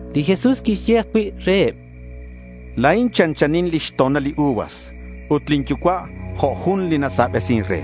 Li Jesús quixye ajcui' reheb: —La̱in chanchanin li xto̱nal li uvas. Ut lin Yucua' jo' jun li nasabesin re.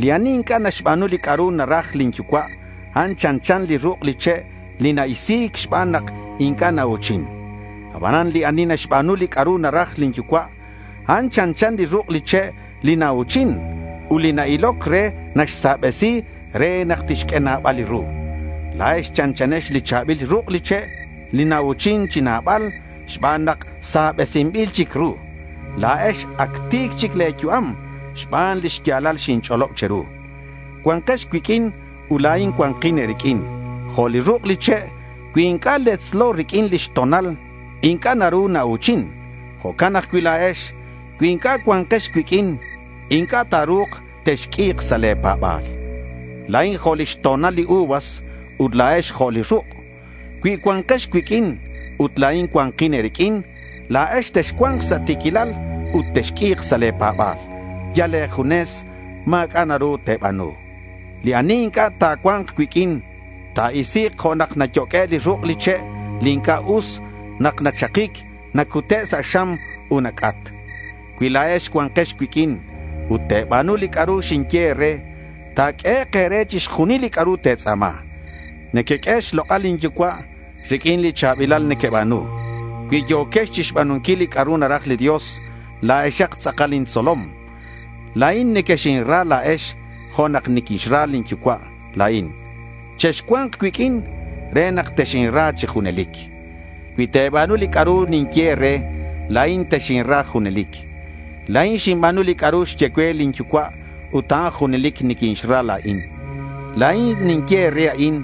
Li ani inc'a' naxba̱nu li c'a'ru naraj lin Yucua', a'an chanchan li ruk' li che' li na-isi̱c xban nak inc'a' nau̱chin. Abanan li ani naxba̱nu li c'a'ru naraj lin Yucua', a'an chanchan li ruk' li che' li nau̱chin. Ut li na-iloc re naxsabesi re nak tixq'ue nabal li ru. La̱ex chanchanex li cha̱bil ruk' li che' li nau̱chin chi nabal xban nak sabesinbil chic ru. La̱ex ac ti̱c chic le̱ yu'am xban li xya̱lal xinch'olob che̱ru. Cua̱nkex cuiq'uin ut la̱in cua̱nkin e̱riq'uin. Jo' li ruk' li che', cui inc'a' letzlo riq'uin lix to̱nal, inc'a' naru nau̱chin. Jo'can ajcui' la̱ex. Cui inc'a' cua̱nkex cuiq'uin, inc'a' ta̱ru̱k texq'ui̱k sa' le̱ pa̱ba̱l. La̱in jo' li xto̱nal li uvas ut la̱ex jo' li ruk'. Cui cua̱nkex cuiq'uin ut la̱in cua̱nkin e̱riq'uin, la̱ex texcua̱nk sa' ti̱quilal ut texq'ui̱k sa' le̱ pa̱ba̱l. Yal e̱junes ma̱c'a' naru te̱ba̱nu. Li ani inc'a' ta̱cua̱nk cuiq'uin ta̱isi̱k jo' nak nayoq'ue' li ruk' li che' li inc'a' us. Nak nachakic nacute' sa' xam ut nac'at. Cui la̱ex cua̱nkex cuiq'uin ut te̱ba̱nu li c'a'ru xinye e̱re, ta̱q'uehek' e̱re chixjunil li c'a'ru te̱tz'a̱ma. Nequeq'ue xlok'al lin Yucua' riq'uin li cha̱bilal nequeba̱nu. Cui yo̱kex chixba̱nunquil li c'a'ru naraj li Dios, la̱exak tz'akal intzolom. La̱in nequexinra la̱ex jo' nak ninxra lin Yucua' la̱in. Chexcua̱nk cuiq'uin re nak texinra chi junelic. Cui te̱ba̱nu li c'a'ru ninye e̱re, la̱in texinra junelic. La̱in xinba̱nu li c'a'ru xye cue lin Yucua' ut a'an junelic niquinixra la̱in. La̱in ninye e̱re a'in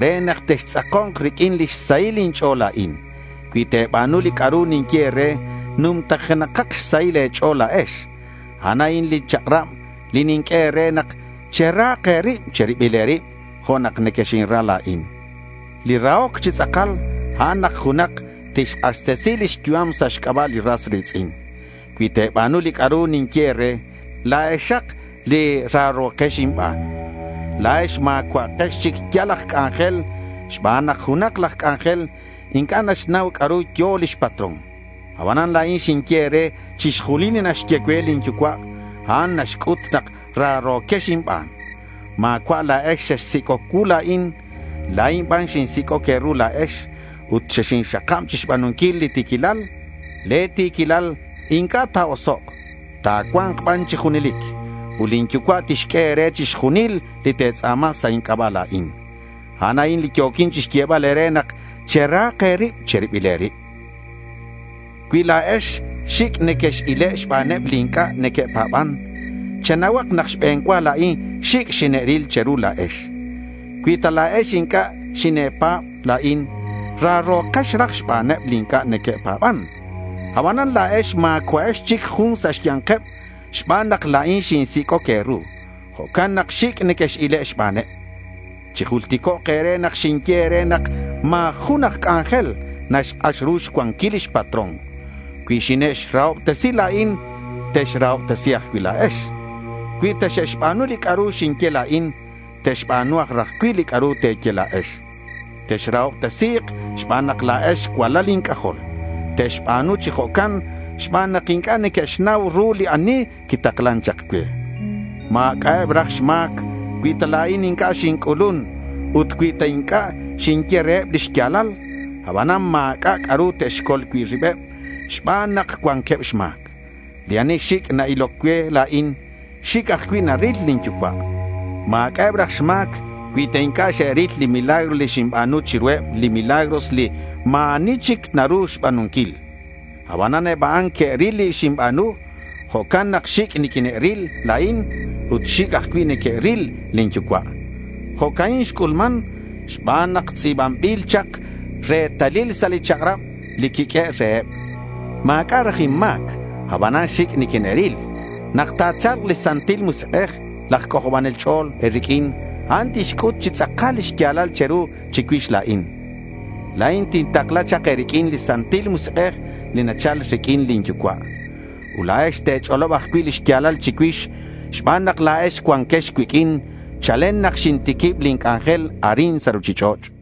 re nak textz'ako̱nk riq'uin lix sahil inch'o̱l la̱in. Cui te̱ba̱nu li c'a'ru ninye e̱re, numtajenakak xsahil e̱ch'o̱l la̱ex. A'an a'in li chak'rab li ninq'ue e̱re nak cherahak e̱rib che̱ribil e̱rib jo' nak nequexinra la̱in. Li rahoc chi tz'akal a'an nak junak tixk'axtesi lix yu'am sa' xc'aba' li ras ri̱tz'in. Cui te̱ba̱nu li c'a'ru ninye e̱re, la̱exak li raro̱kex inban. La̱ex ma̱cua'akex chic yal aj c'anjel xban nak junak laj c'anjel inc'a' naxnau c'a'ru yo̱ lix patrón. Abanan la̱in xinye e̱re chixjunil li naxye cue lin Yucua'. A'an naxc'ut nak raro̱quex inban. Ma̱cua' la̱ex xexsic'oc cuu la̱in. La̱in ban xinsic'oc e̱ru la̱ex ut xexinxakab chixba̱nunquil li ti̱quilal. Le̱ ti̱quilal inc'a' ta̱osok'. Ta̱cua̱nk ban chi junelic. Ut lin Yucua' tixq'ue e̱re chixjunil li te̱tz'a̱ma sa' inc'aba' la̱in. A'an a'in li yo̱quin chixyebal e̱re nak cherahak e̱rib che̱ribil e̱rib. Cui la̱ex xic' nequex-ile' xbaneb li inc'a' neque'pa̱ban, chenauhak nak xbe̱n cua la̱in xic' xine'ril che̱ru la̱ex. Cui ta la̱ex inc'a' xine̱pa̱b la̱in, raro̱kex raj xbaneb li inc'a' neque'pa̱ban. Abanan la̱ex ma̱cua'ex chic jun sa' xya̱nkeb xban nak la̱in xinsic'oc e̱ru. Jo'can nak xic' nequex-ile' xbaneb. Chijulticok' e̱re nak xinye e̱re nak ma̱ jun aj c'anjel naxk'ax ru xcuanquil lix patrón. Cui xine'xrahobtesi la̱in, texrahobtesi̱k ajcui' la̱ex. Cui ta xe'xba̱nu li c'a'ru xinye la̱in, te'xba̱nu aj raj cui' li c'a'ru te̱ye la̱ex. Texrahobtesi̱k xban nak la̱ex cualal inc'ajol. Te'xba̱nu chi jo'can xban nak inc'a' neque'xnau ru li ani quitaklan chak cue. Ma̱c'a'eb raj xma̱c cui ta la̱in inc'a' xinc'ulun ut cui ta inc'a' xinye reheb li xya̱lal. Abanan ma̱c'a' c'a'ru te'xcol cui' ribeb xban nak cuanqueb xma̱c. Li ani xic' na-iloc cue la̱in, xic' ajcui' naril lin Yucua'. Ma̱c'a'eb raj xma̱c cui ta inc'a' xe'ril li milagros li xinba̱nu chiruheb, li milagros li ma̱ ani chic naru xba̱nunquil. Abanan eb a'an que'ril li xinba̱nu. Jo'can nak xic' niquine'ril la̱in ut xic' ajcui' neque'ril lin Yucua'. Jo'ca'in xc'ulman xban nak tz'i̱banbil chak retalil sa' li chak'rab li quiq'uehe' reheb: Ma̱c'a' raj inma̱c, abanan xic' quine'ril. Nak ta̱cha̱lk li Santil Musik'ej, laj C'ojobanel Ch'o̱l, e̱riq'uin a'an tixc'ut chi tz'akal li xya̱lal che̱ru chicuix la̱in. La̱in tintakla chak e̱riq'uin li Santil Musik'ej li nachal riq'uin lin Yucua'. Ut la̱ex te̱ch'olob ajcui' li xya̱lal chicuix xban nak la̱ex cuanquex cuiq'uin chalen nak xintiquib lin c'anjel arin sa' ruchich'och'.